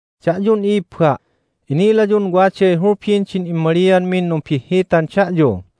Da'yun i'ibba', inilayun waday hulbin din immalianmin numbihhitan da'yu.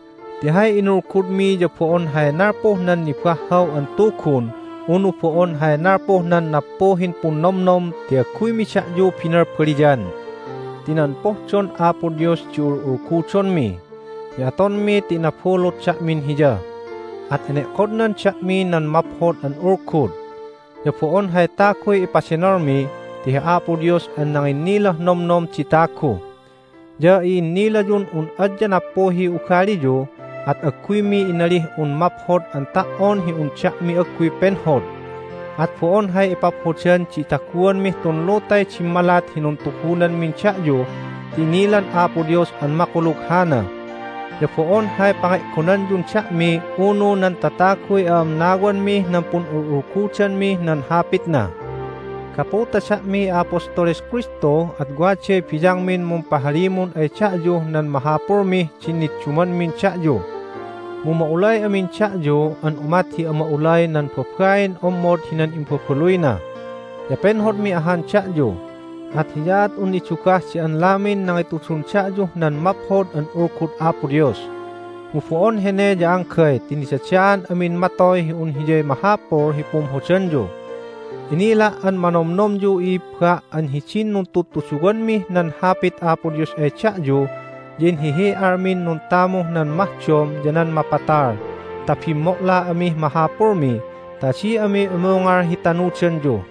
Ti hay inulgudmi ya bo'on hay nalpuh nan nibahhaw an tugun unu bo'on hay nalpuh nan nappuhin punnomnom ti agguymi da'yu binalbaliyan. Ti nan pohdon Apo Dios di ul'ulgudonmi. Ya atonmi ti inabulut da'min Hiya, at ene'kodnan da'mi nan Maphod an Ulgud. Ya bo'on hay taguy ipadenolmi ti hi Apo Dios an nanginnilah nomnom di tagu. Ya i'innilayun un adya nappuhiy ugaliyu, at agguymi inalih un maphod an ta"on hi un da'mi agguy penhod. At bo'on hay ipaphodan di itaguanmih tun lutay dimmalat hi nuntugunanmin da'yu ti inilan Apo Dios an makulug hana! Ya bo'on hay pange'gonanyun da'mi unu nan tataguy a'amnawanmih nan pun'ul'ulgudanmih nan Hapitna. Gapu ta da'miy a'apostoles Kristu at waday biyangmin mumpahalimun ay da'yuh nan mahapulmih din niddumanmin da'yu. Mu ma'ulay amin da'yu an umat hi ama'ulay nan babain ommod hinan imbabaluyna. Ya penhodmi ahan da'yu, at hiyaat un nidugah di anlamin nangitudun da'yuh nan Maphod an Ulgud Apo Dios. Mu bo'on hene ya anggay ti nidadaan amin matoy hi un hiyay mahapul hi pumhodanyu! Inila' an manomnomyu, i'ibba', an hidin nuntudtuduwanmih nan Hapit Apo Dios ay da'yu ya inhihi'almin nuntamuh nan mahdom ya nan mapatal ta bimmo'la amih mahapulmi ta adi ami umungal hi tanudanyu.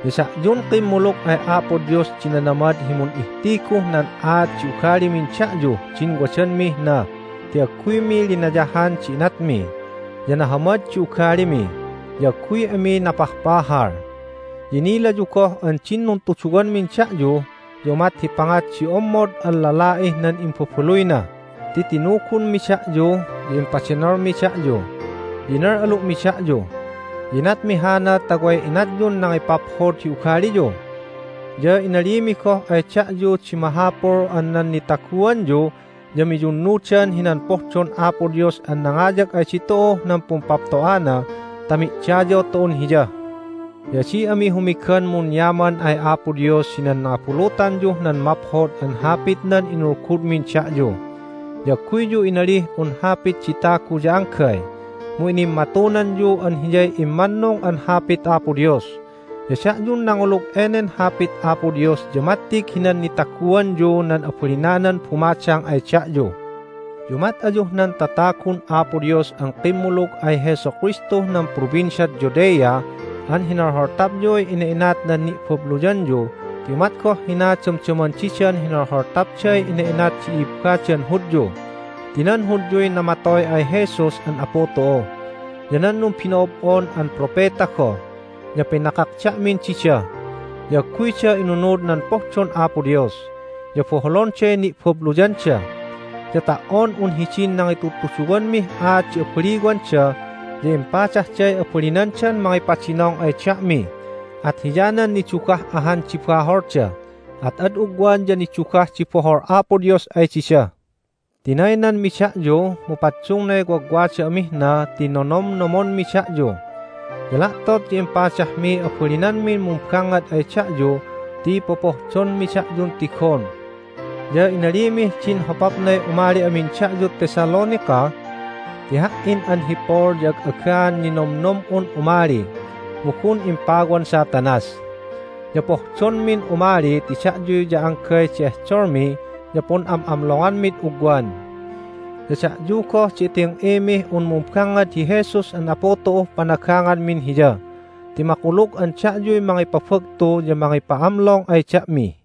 Ya da'yun kimmulug ay Apo Dios di nanamad hi mun'ihtiguh nan aat di ugalimin da'yuh din wadanmih na ti agguymi linayahan di inatmi, ya nahamad di ugalimi, ya agguy ami napahpahal. Ya inilayu goh an din nuntuduwanmin da'yu ya umat hi pangat di ommod an lala'ih nan imbabaluyna ti tinugunmi da'yu, ya impadenolmi da'yu, ya inal'alu'mi da'yu. Ya inatmi hana ta way inatyun nangipaphod hi ugaliyu. Ya inalimi goh ay da'yu di mahapul an nan nitaguanyu ya miyunnudan hinan pohdon Apo Dios an nangayag ay ditu'uh nan pumpapto'ana ta mi'dayaw tu'un Hiya. Ya adi ami humigan munyaman ay Apo Dios hinan nangabulutanyuh nan Maphod an Hapitnan inulgudmin da'yu. Ya agguyyu inalih un hapit di tagu ya anggay, mu inimmatunanyu an hiyay immannung an Hapit Apo Dios. Ya da'yun nangulug enen Hapit Apo Dios ya mattig hinan nitaguanyu nan abalinanan bumadang ay da'yu. Ya umat ayuh nan tatagun Apo Dios an kimmulug ay Jesu Kristuh nan Provinciad Judea an hinolholtapyuy ina'inat nan ni'babluyanyu ti umat goh hina damdaman didan hinolholtapday ina'inat di i'ibbadan Hudyu. Ti nan Hudyuy namatoy ay Jesus an Apu tu'u, ya nan numbino'ob'on an propeta goh, ya pinakak da'min dida. Ya agguyda inunud nan pohdon Apo Dios, ya boholonday ni'babluyanda! Ya ta"on un hidin nangitudtuduwanmih aat di abaliwanda ya impadahday abalinandan mangipadinong ay da'mi. At hiyanan nidugah ahan di baholda, at ad ugwan ya nidugah di bohol Apo Dios ay dida. Tinaynanmi da'yu, mu paddungnay wagwada amih na ti nonomnomonmi da'yu. Ya la'tot ya impadahmiy abalinanmin mumbangngad ay da'yu ti popohdonmi da'yun tigon! Ya inalimih din hopapnay umali amin da'yud Thessalonica. Ti ha"in an hi Paul ya ag'agaan ninomnom'un umali, mu gun impawan Satanas. Ya pohdonmin umali ti da'yu ya anggay di ehdolmi ya pun'am'amlonganmid ugwan. Ya da'yu goh di iting'imih un mumbangngad hi Jesus an Apu tu'uh panaganganmin Hiya. Ti makulug an da'yuy mangipabagtu ya mangipa'amlong ay da'mi.